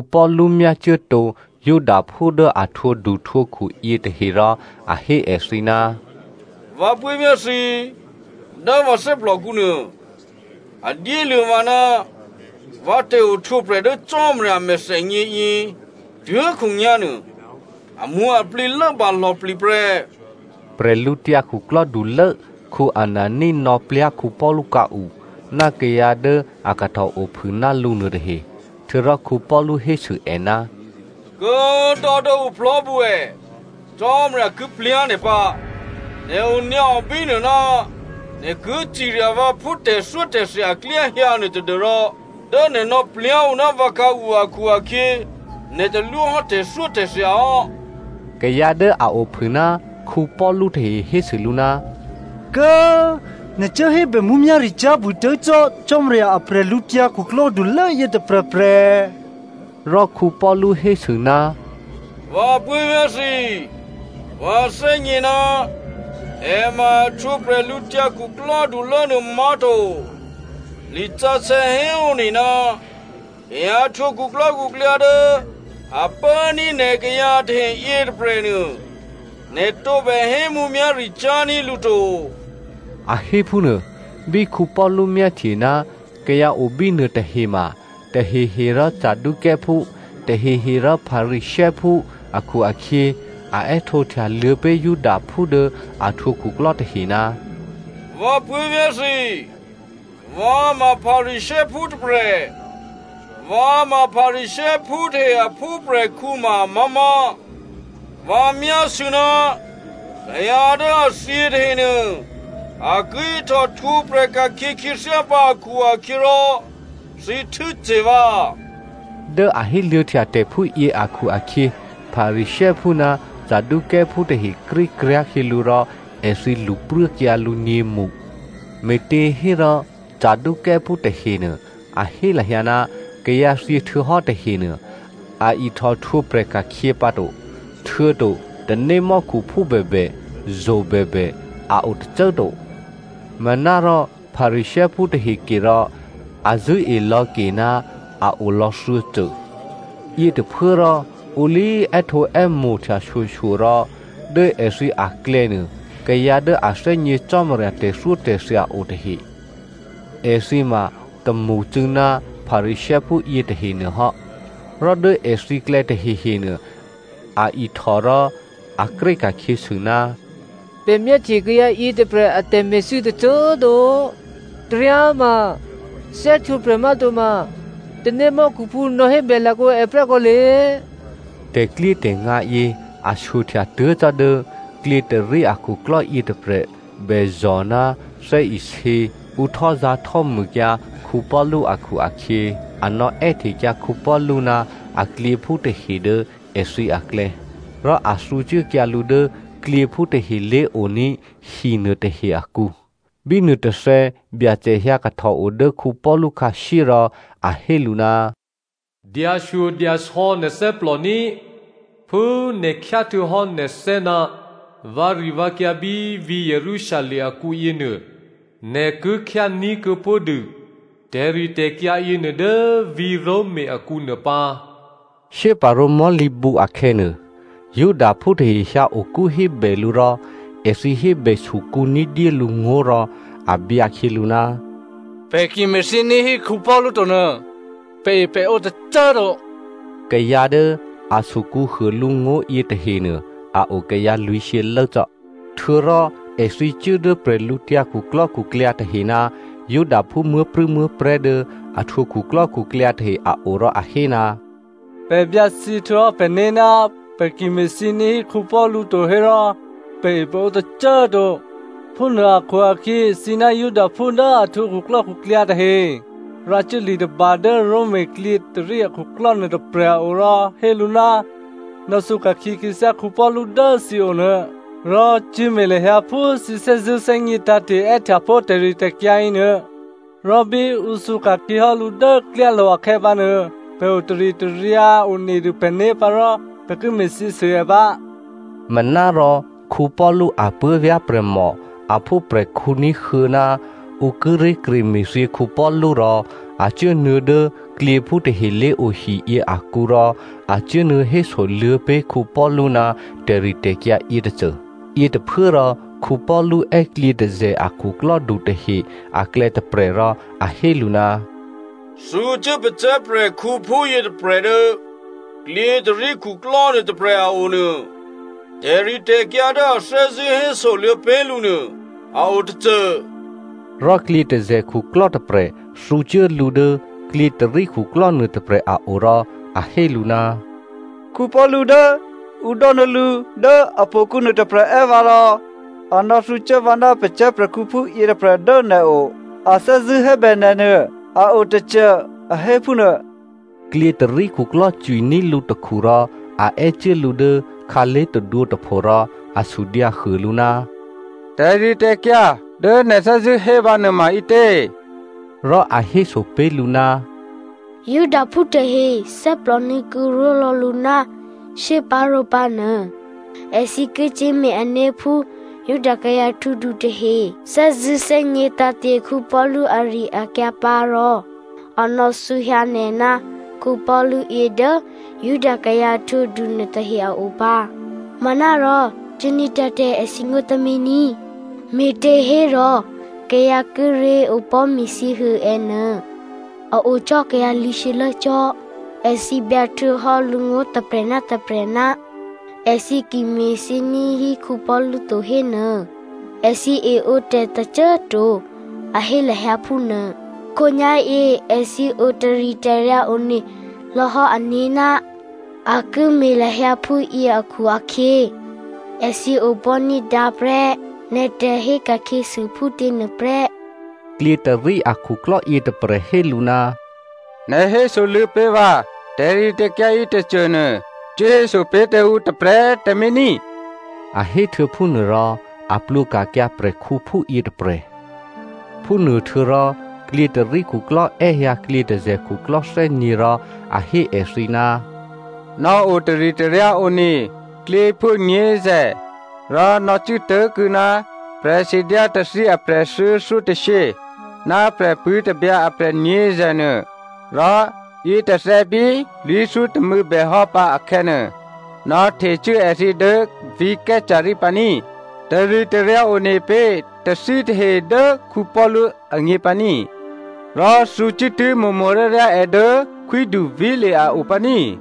Paulu myácuốtǒ Judaphú dố a htwǒduhtwǒkhu yětahe rò a hé èthǐ, “Vǎ puố̤vyá̤ thǐ꤮, dố vǎ thè́plòkǔnuô a dyéluô̌ vǎ ná vǎ tè̤ohtwǒprè̤ dố Cò́marya a mèthènyěyě, tuố̤khǒnyá̤nuô, amwǒ̤aplǐ lốbǎ lò̌plǐ prè́.” Bwídukhulố Anania nò̌plyá̤ Paulu khǎu ná kayǎ dố a kahtòophû ná lǔ nuôtahe. Htuô̌rò Paulu hésû è, “Kố꤮ dò́ dố ǔ plò̤́bǔ è꤮, Cò́marya ki plyá̤ nè̤ pǎ! Nè̤ onyǎo bínuô ná nè̤ ki cirya vǎ phú tè̤thyótè̤thya aklyá hyǎ nuô tadû́rò dố nè̤ nò̌plyá̤ ǔ ná vǎ khǎu akhu-akhyě nè̤ talwóhò́ tè̤thyótè̤thya hò́.” Kayǎ dố a ophû ná Paulu tahe hésû lǔ, “Kố꤮ nè̤ cuố hébè mǔmyá̤ricyá̤ bûtuố̤ cò́ Cò́marya a bwídukhulố yětôprè̤prè̤!” Rò Paulu hésû, “Vǎ puố̤vyá̤ thǐ꤮, vǎ thè́gně ná è ma a htwǒ bwídukhulố nuô má̤to. Lisǎsè̌ héone, ‘Kayǎ htwǒ khuklò́khuklyǎ dố a pốní̤ nè̤ kayǎ tahe yětôprè̤nuô, nè̤ tǒbè hé mǔmyá̤ricyá̤ ní̤ lǔ to,’” a hé phúnuô. Bí Paulu myáhtye ná kayǎ obínuô tahe ma tahehe rò Saducěophú, tahehe rò Pharisěophú akhu-akhyě, a è́htǒhtyaluô̌ pé̤ Judaphú dố a htwǒ khuklò́ tahe, “Vǎ puố̤vyá̤ thǐ꤮, vǎ ma Pharisěophú tôprè̤. Vǎ ma Pharisěophú tahe a phúprè̤khǔ ma amá̤má̤. Vǎ myásû̌ ná kayǎ dố a thyě tahenuô, a ki ihtòhtwǒprè̤ ka̤khyě khyěthyá pǎ akhu-akhyěrò thǐ htû́ce̤ vǎ.” Dố a héluô̌htya tè̤ phúyě akhu-akhyě, Pharisěophú ná Saducěophú tahe krékryá̤ khyělǔ rò èthǐ lṳpruốkyǎ lǔ nyě̤mṳ. (Me̤těhérò Saducěophú tahenuô, a hé lahyǎ, kayǎ thyě htuô̌hò́ tahenuô, a ihtòhtwǒprè̤ ka̤khyě pǎto. Htuô̌to tanémò́khuphú bèbè, zo̤ bèbè, a o tôcô꤮ to. Manárò Pharisěophú tahe ke rò, a zṳ̂́e lò̌ ke ná a olò̌ thuô̌cô.) Yětôphuốrò ǔ lé꤮ è́htǒè́mo̤htya shyoshyo rò dố èthǐ aklè̌nuô kayǎ dố a thè́gně Cò́marya tè̤thyótè̤thya o tahe, èthǐ ma tômṳcû̌ ná Pharisěophú yětahe nuôhò́, rò dố èthǐklè̌ tahehenuô, a ihtò rò a kré ka̤khyěsû, “Pè̤ myáhtye kayǎ yětôprè̤ a tè̤me̤thû́ tôcô꤮ to. Taryáma thè́htwǒprè̤ má̤toma tanémò́khuphú nò̌hébè lakǒ è prè́ kǒle.” Tè̤klyétè̤ngǎ yě a shyohtya tuố̤ cò́ dố klyětôrí akhuklò́ yětôprè̤ bèzò̤ ná thè́isě ǔ htò́zǎ̤htò́mûkyǎ Paulu akhu-akhyě, a nò̌è́htekyǎ Paulu ná aklyěphú tahe dố èthǐ aklè̌, rò a thǔcuốkyǎ lǔ dố klyěphú tahe lé̤oní̤ hi nuôtahe akǔ. Bí nuôtôthè̌, Byacè hyǎ kahtòo dố Paulu khǎshyé rò a hé lǔ, “Dyashyodyasò̌ nè̤ thè́plò ní꤮. Phú nè̤ khyá htuô̌hò́ nè̤thè́ ná vǎrivǎkyǎ bí vǐ̤ Jerusalem akǔ yěnuô, nè̤ ki khyání̤kuô̌ pó̤dû tè̤ritè̤kyǎ yěnuô dố vǐ̤ Roma akǔ nuôpǎ.” Shyéparǒ mò̤́lǐbǔ akhè̌nuô, Judaphú tahe hyǎokú hébè lǔ rò èthǐ hébè sukǔ ní̤dyé lǔ ngó̤ rò a byǎkhyělǔ, “Pè̤ ki me̤thyění̤ hí Paulu to nuô, pè̤epè̤ǒ tôcô꤮ to.” Kayǎ dố a sukǔhuô lǔ ngó̤ yětahenuô, a o kayǎ lwǐ̤shyě lốcò́. Htuô̌rò èthǐ cuố dố bwídukhu tahe ná Judaphú muố̤prû̌muố̤prè̤́ dố a htwǒ khuklò́khuklyǎ tahe a o rò a hé, “Pè̤ byǎthyě htuô̌hò́ pè̤né̤ ná pè̤ ki me̤thyění̤ hí Paulu to hérò pè̤epè̤ǒ tôcô꤮ to. Phúnuô akhu-akhyě thǐ ná Judaphú dố a htwǒ khuklò́khuklyǎ tahe rǎcuố li tôba dố Roma klyětôrí akhuklò́ nuôtôprè̤ a o rò hé lǔ, nò̌thǔka̤khyě khyěthyá Paulu dố thǐ onuô. Rò cyé̤me̤ lahyǎ phú thǐ thè́zṳ̂́ thè́gně tǎ̤te̤ è́htyapó̤ tè̤ritè̤kyǎ yěnuô. Rò bí ǔ thǔka̤khyěhò́ lǔ dố klyálo̤ akhè̌ pǎnuô, pè̤ otaritaryǎ onedû pè̤né̤ pǎ rò pè̤ ki me̤thyěsû è pǎ.” Manárò Paulu apuố̤vyá̤ prè̤mò a phúprè̤khǔ ní̤huô̌ ná ǔ kíré̤ kreme̤thyě Paulu rò, a cuốnuô̌ dố klyěphú tahe lé̤ohiyě akǔ rò a cuốnuô̌ hésoluô̌ pé̤ Paulu ná tè̤ritè̤kyǎ yětôcô. Yětôphuốrò Paulu è́ klyětôzè̤ a khuklò́du tahe aklè̌ tôprè̤ rò a hé lǔ, “Thǔcuố pacè̤̌ prè̤khǔphú yětôprè̤ dố klyětôrí khuklò́ nuôtôprè̤ a o nuô. Tè̤ritè̤kyǎ dố a thè́zṳ̂́ hésoluô̌ pé̤ lǔ nuô, a o tôcô.” Rò klyětôzè̤ khuklò́ tôprè̤ thǔcuố lǔ dố klyětôrí khuklò́ nuôtôprè̤ a o rò a hé lǔ, “Paulu dố ǔ dò́nuô̌ lǔ dố htò̌kǔ nuôtôprè̤ è́ vǎ rò a nò̌thǔcuố vǎ ná pacè̤̌ prè̤khǔphú yětôprè̤ dố nè̤o. A thè́zṳ̂́ hébè nè̤nuô, a o tôcô, a hé phúnuô.” Klyětôrí khuklò́ cwiní̤ lǔtakhu rò a è́cuố lǔ dố khǎlé̤ tadwǒ tôpho rò a sudyǎhuô lǔ, “Tè̤ritè̤kyǎ dố nè̤ thè́zṳ̂́ hé vǎnuô ma ǐtě?” Rò a héso pé̤ lǔ, “Judaphú tahe thè́plò nuô̌kǔ ró̤lò̌ lǔ ná shyéparǒ pǎnuô, èthǐ ki cyé̤me̤ ané̤ phú Juda kayǎ htwǒdu tahe thè́zṳ̂́ thè́gně tǎ̤te̤ Paulu ari-akyǎ pǎ rò a nò̌thǔhyǎ nè̤ ná Paulu yě dố Juda kayǎ htwǒdu nuôtahe a o pǎ. Manárò cuốní̤dǎ tǎ èthǐngó̤ tǎmé̤ ní꤮, me̤těhérò kayǎ kíré̤ opò̤́ me̤thyěhuô è́nuô a o cò́ kayǎ lwǐ̤shyě lốcò́. Èthǐ byǎhtuô̌hò́ lǔngó̤ tôprè̤ ná tôprè̤, èthǐ ki me̤thyění̤ hí Paulu to hénuô, èthǐ eǒ tè̤ tôcô꤮ to, a hé lahyǎ phúnuô꤮. Khǒnyá̤yě èthǐ o taritaryǎ one lò̌hò́ ané̤ ná a ki me̤ lahyǎ phúyě akhu-akhyě, èthǐ opò̤́ ní̤dǎ prè́ nè̤ tè̤hé ka̤khyěsû phútě nuôprè́.” Klyětôrí akhuklò́ yětôprè̤ hé lǔ, “Nè̤ hésoluô̌ pé̤ vǎ tè̤ritè̤kyǎ yětôcô nuô, cuốhéso pé̤ tǎ ǔ tôprè̤꤮ tǎmé̤ ní꤮.” A héhtuô̌ phúnuô rò a plwǒka̤kyǎ prè̤khǔphú yětôprè̤. Phúnuô htuô̌rò, klyětôrí khuklò́ è́hyǎ klyětôzè̤ khuklò́ thè́nyě̤ rò a hé èthǐ, “Nò̌ o taritaryǎ one klyěphú nyě̤zè̤, rò nò̌cuố tố̤kuô̌ ná prè̤sidyá tathí aprè̤ thuô̌thyótôshyě, ná prè̤pṳ̂́ tabyǎ aprè̤ nyě̤zè̤ nuô, rò yětôthè̌ bí lwǐ̤thyótômû̌ bèhò́ pǎ akhè̌nuô, nò̌htecuố èthǐ dố vǐ̤ Caesarea pǎ ní꤮. Taritaryǎ one pé̤ tathítahe dố Paulu agně pǎ ní꤮, rò thǔcuốtuố̤ mo̤mo̤ryáryá è dố khwídu Felice a o pǎ ní꤮,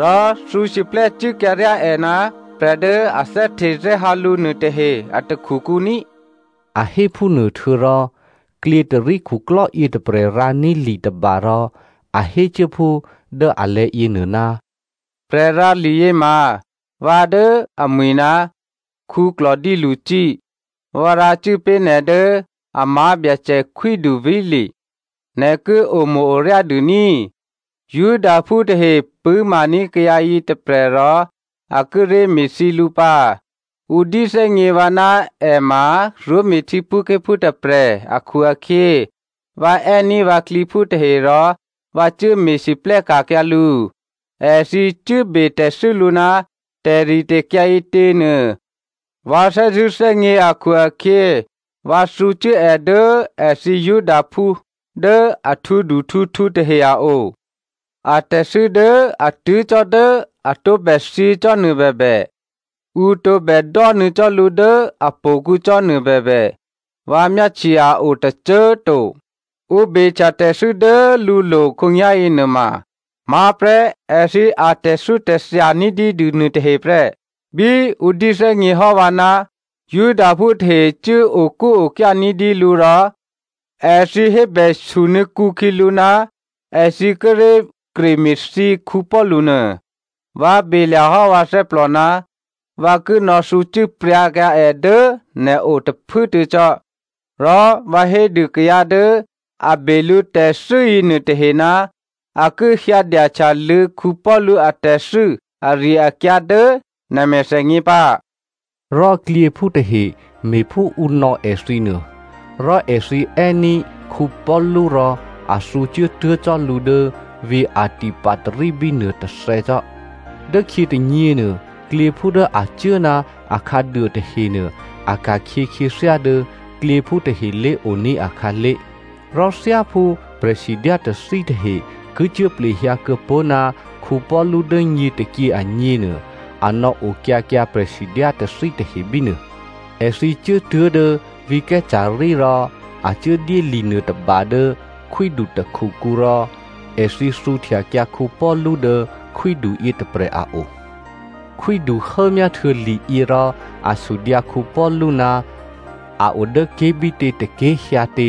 rò thǔsiplè́ cuốkyǎryá è ná prè̤ dố a thè́htethè́hǎ lǔ nuôtahe a takhukǔ ní꤮.” A hé phúnuô htuô̌rò, klyětôrí khuklò́ yětôprè̤ rǎní̤ li tôba rò a hécuố phú dố alè̤̌ yěnuô, Prè̤rǎliyě ma vǎ dố amwi̤ ná Claudio Lysia. Vǎ rǎcuố pé̤ nè̤ dố a má̤ Byacè khwídu Felice. Nè̤ ki omo̤-oryá dû ní꤮. Judaphú tahe pṳ̂́maní̤ kayǎ yětôprè̤ rò a kíré̤ me̤thyě lǔ pǎ. Ǔ dyéthè́gně vǎ ná è ma Roma htyěphúké̤phú tôprè̤ akhu-akhyě, vǎ è́ní̤ vǎ klyěphú tahe rò vǎ cuố me̤lwóhteka̤kyǎ lǔ. Èthǐ cuốbe tè̤thû́ lǔ ná tè̤ritè̤kyǎ ǐtěnuô, vǎ thè́zṳ̂́ thè́gně akhu-akhyě, vǎ thǔcuố è dố èthǐ Judaphú dố a htwǒduhtwǒkhu tahe a o. Atè̤thû́ dố a tuố̤ cò́ dố a tǒbè thyěcò́nuô bèbè, ǔ tǒbè dò́nuô̌ cò́ lǔ dố htò̌kǔ cò́nuô bèbè, vǎ myáhtye a o tôcô꤮ to. Ǔ behtya tè̤thû́ dố lǔlo̤ khǒnyá̤yě nuôma, má̤prè́ èthǐ atè̤thyótè̤thya ní̤dyédû nuôtahe prè́. Bí ǔ dyéthè́gněhò́ vǎ ná Judaphú tahe cuốokúokyá ní̤dyé lǔ rò èthǐ hébè sunuô̌kǔ khyělǔ ná èthǐ kíré̤ kreme̤thyě Paulu nuô, vǎ belya̤hò́ vǎ thè́plò ná vǎ ki nò̌thǔcuố pryǎkyǎ è dố nè̤o tôphuốtuô̌ cò́. Rò vǎ hédû kayǎ dố a be lǔ tè̤thû́ yěnuôtahe ná a ki hyǎdyahtyaluô̌ Paulu atè̤thû́ ari-akyǎ dố nè̤ mèthènyě pǎ. Rò klyěphú tahe me̤phú ǔ nò̌ èthǐ nuô. Rò èthǐ è́ní̤ Paulu rò a thǔcuố tuố̤ cò́ lǔ dố vǐ̤ Antipatri bínuô tôthè̌cò́. Dốkhyě tônyěnuô, klyěphú dố a cuố ná akhǎduô tahenuô a ka̤khyě khyěthyá dố klyěphú tahe lé̤oní̤ akhǎlé̤. Rò thyáphú prè̤sidyá tathí tahe ki cuố plehyǎ kuô̌pó̤ ná Paulu dố nyě tôkyě agněnuô, a nò̌okyǎkyǎ prè̤sidyá tathí tahe bínuô. Èthǐ cuốtuố̤ dố vǐ̤ Caesarea rò, a cuốdyé li nuôtôba dố khwídu takhukǔ rò èthǐ thǔhtyakyǎ Paulu dố khwídu yětôprè̤ a o. Khwídu hốmyáhtuô̌ liyě rò a sudyǎ Paulu ná a odố ké̤bítě tôké̤ hyǎtě,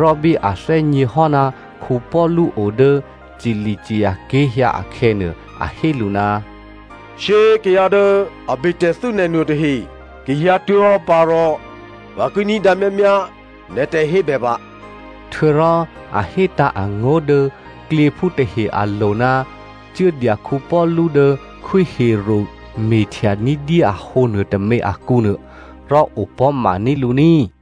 rò bí a thè́gněhò́ ná Paulu o dố Cilicia ké̤ hyǎ akhè̌nuô, a hé lǔ, “Shyé꤮ kayǎ dố a be tè̤thû́ nè̤ nuôtahe ki hyǎtuố̤hò́ pǎ rò vǎ ki ní̤dǎ myámyá nè̤ tè̤hébè pǎ.” Htuô̌rò, a hétǎ̤ angó̤ dố klyěphú tahe alo̤ ná cuốdya Paulu dố Khwí Herodè me̤htya ní̤dyé ahǒ nuôtômě akǔnuô, rò opò̤́maní̤ lǔ ní꤮.